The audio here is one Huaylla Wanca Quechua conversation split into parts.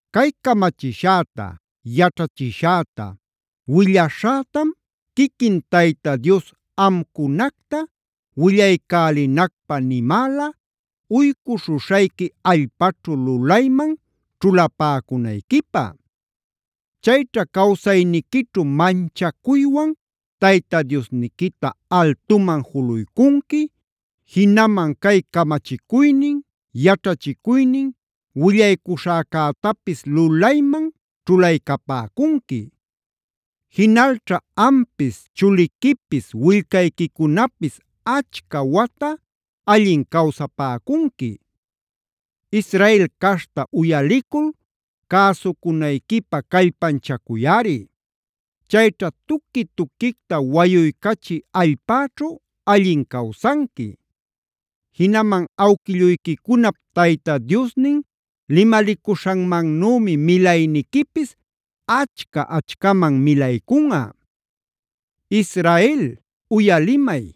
“Cay camachishäta, yaćhachishäta, willäśhätam quiquin Tayta Dios amcunacta willaycälinacpä nimäla uycuśhuśhayqui allpaćhu lulayman ćhulapäcunayquipä. Chayćha cawsayniquićhu manchacuywan Tayta Diosniquita altuman juluycunqui, jinaman cay camachicuynin, yaćhachicuynin willaycuśhäcätapis lulayman ćhulaycapäcunqui. Jinalćha ampis, chuliquipis, willcayquicunapis achca wata allin cawsapäcunqui. Israel caśhta uyalicul cäsucunayquipä callpanchacuyꞌari. Chayćha tuqui-tuquicta wayuycachï allpäćhu allin cawsanqui. Jinaman awquilluyquicunap Tayta Diosnin limalicuśhanmannümi milayniquipis achca-achcaman milaycunꞌa. “Israel, uyalimay: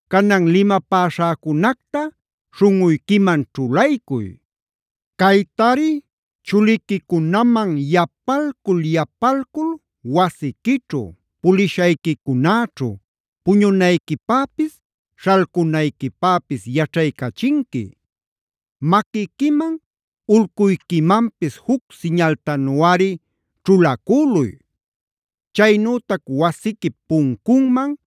“Canan limapäśhäcunacta śhunꞌuyquiman ćhulaycuy. Caytari chuliquicunaman yapalcul-yapalcul wasiquićhu, pulishayquicunäćhu, puñunayquipäpis, śhalcunayquipäpis yaćhaycachinqui. Maquiquiman, ulcuyquimanpis juc siñaltanuꞌari ćhulacüluy. Chaynütac wasiquip puncunman,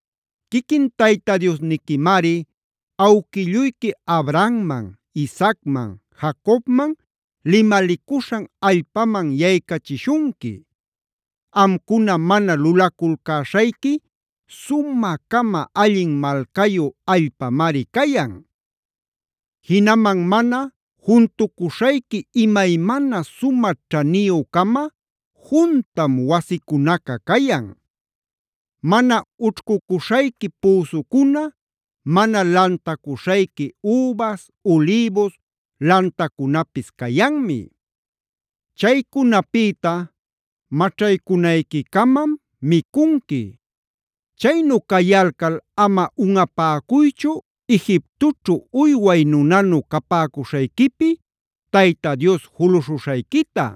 “Quiquin Tayta Diosniquimari awquilluyqui Abrahamman,d Isaacman,e Jacobmanf limalicuśhan allpaman yaycachishunqui. Amcuna mana lulaculcäśhayqui sumä-cama allin malcayu allpamari cayan. Jinaman mana juntucuśhayqui imaymana sumä ćhaniyü-cama juntam wasicunaca cayan. Mana ućhcuśhayqui püsucuna, mana lantacuśhayqui übas, ulïbus lantacunapis cayanmi. Chaycunapïta maćhaycunayquicamam micunqui. Chaynu cayalcal ama unꞌapäcuychu Egiptoćhu uyway nunanu capäcuśhayquipi Tayta Dios juluśhuśhayquita.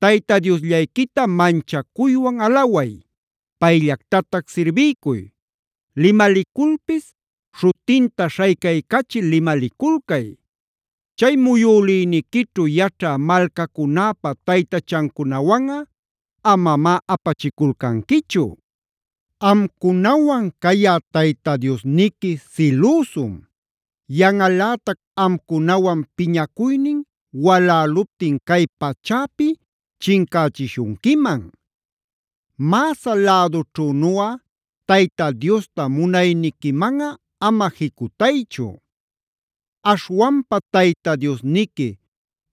Tayta Diosllayquita manchacuywan alaway; payllactatac sirbiycuy;g limaliculpis śhutinta śhaycaycachil limaliculcay. Chay muyülïniquićhu yaćha malcacunäpa taytachancunawanꞌa amamá apachiculcanquichu. Amcunawan cayä Tayta Diosniqui silüsum. Yanꞌalätac amcunawan piñacuynin waläluptin cay pachäpi chincächishunquiman. “Masahh lädućhünuꞌa Tayta Diosta munayniquimanꞌa ama jicutaychu.i Aśhwanpa Tayta Diosniqui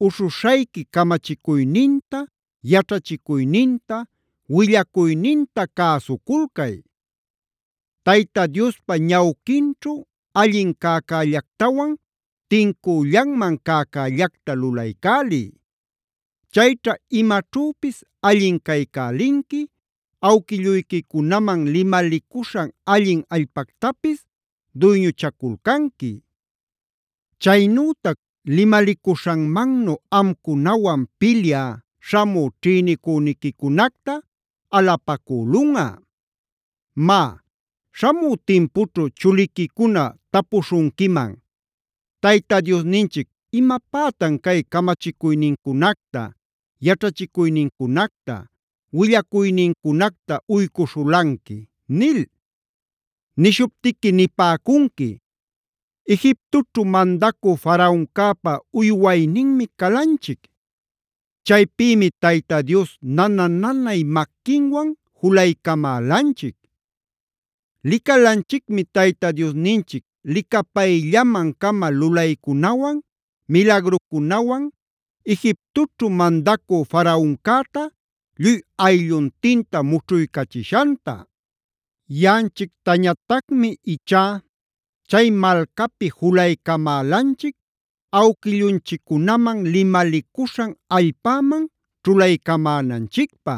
uśhuśhayqui camachicuyninta, yaćhachicuyninta, willacuyninta cäsuculcay. Tayta Diospa ñawquinćhu allin cäcällactawan tincüllanman cäcällacta lulaycäliy. Chayćha imaćhüpis allin caycälinqui, awquilluyquicunaman limalicuśhan allin allpactapis duyñuchaculcanqui. Chaynütac limalicuśhanmannu amcunawan pilyä śhamü ćhïnicüniquicunacta alapacülunꞌa. “Má, śhamü timpućhu chuliquicuna tapuśhunquiman: ‘¿Tayta Diosninchic imapätan cay camachicuynincunacta, yaćhachicuynincunacta, willacuynincunacta uycuśhulanqui?’ nil. Nishuptiqui nipäcunqui: ‘Egiptoćhu mandacü Faraoncäpa uywayninmi calanchic. Chaypïmi Tayta Dios nana-nanay maquinwan julaycamälanchic. Licalanchicmi Tayta Diosninchic licapayllaman-cama lulaycunawan, milagrucunawan Egiptoćhu mandacü Faraoncäta lluy aylluntinta mućhuycachishanta. Yaꞌanchictañatacmi ichá chay malcapi julaycamälanchic awquillunchiccunaman limalicuśhan allpäman ćhulaycamänanchicpä.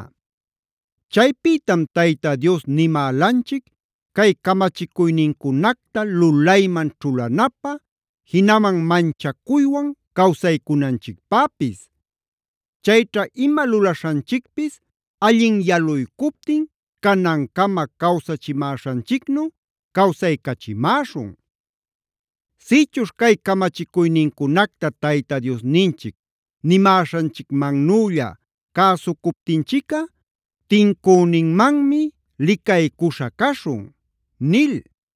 Chaypïtam Tayta Dios nimälanchic cay camachicuynincunacta lulayman ćhulanapä, jinaman manchacuywan cawsaycunanchicpäpis. Chayćha ima lulaśhanchicpis allin yaluycuptin canancama cawsachimäśhanchicnu cawsaycachimäśhun. Sïchuśh cay camachicuynincunacta Tayta Diosninchic nimäśhanchicmannülla cäsucuptinchicꞌa tincüninmanmi licaycuśha caśhun’ nil.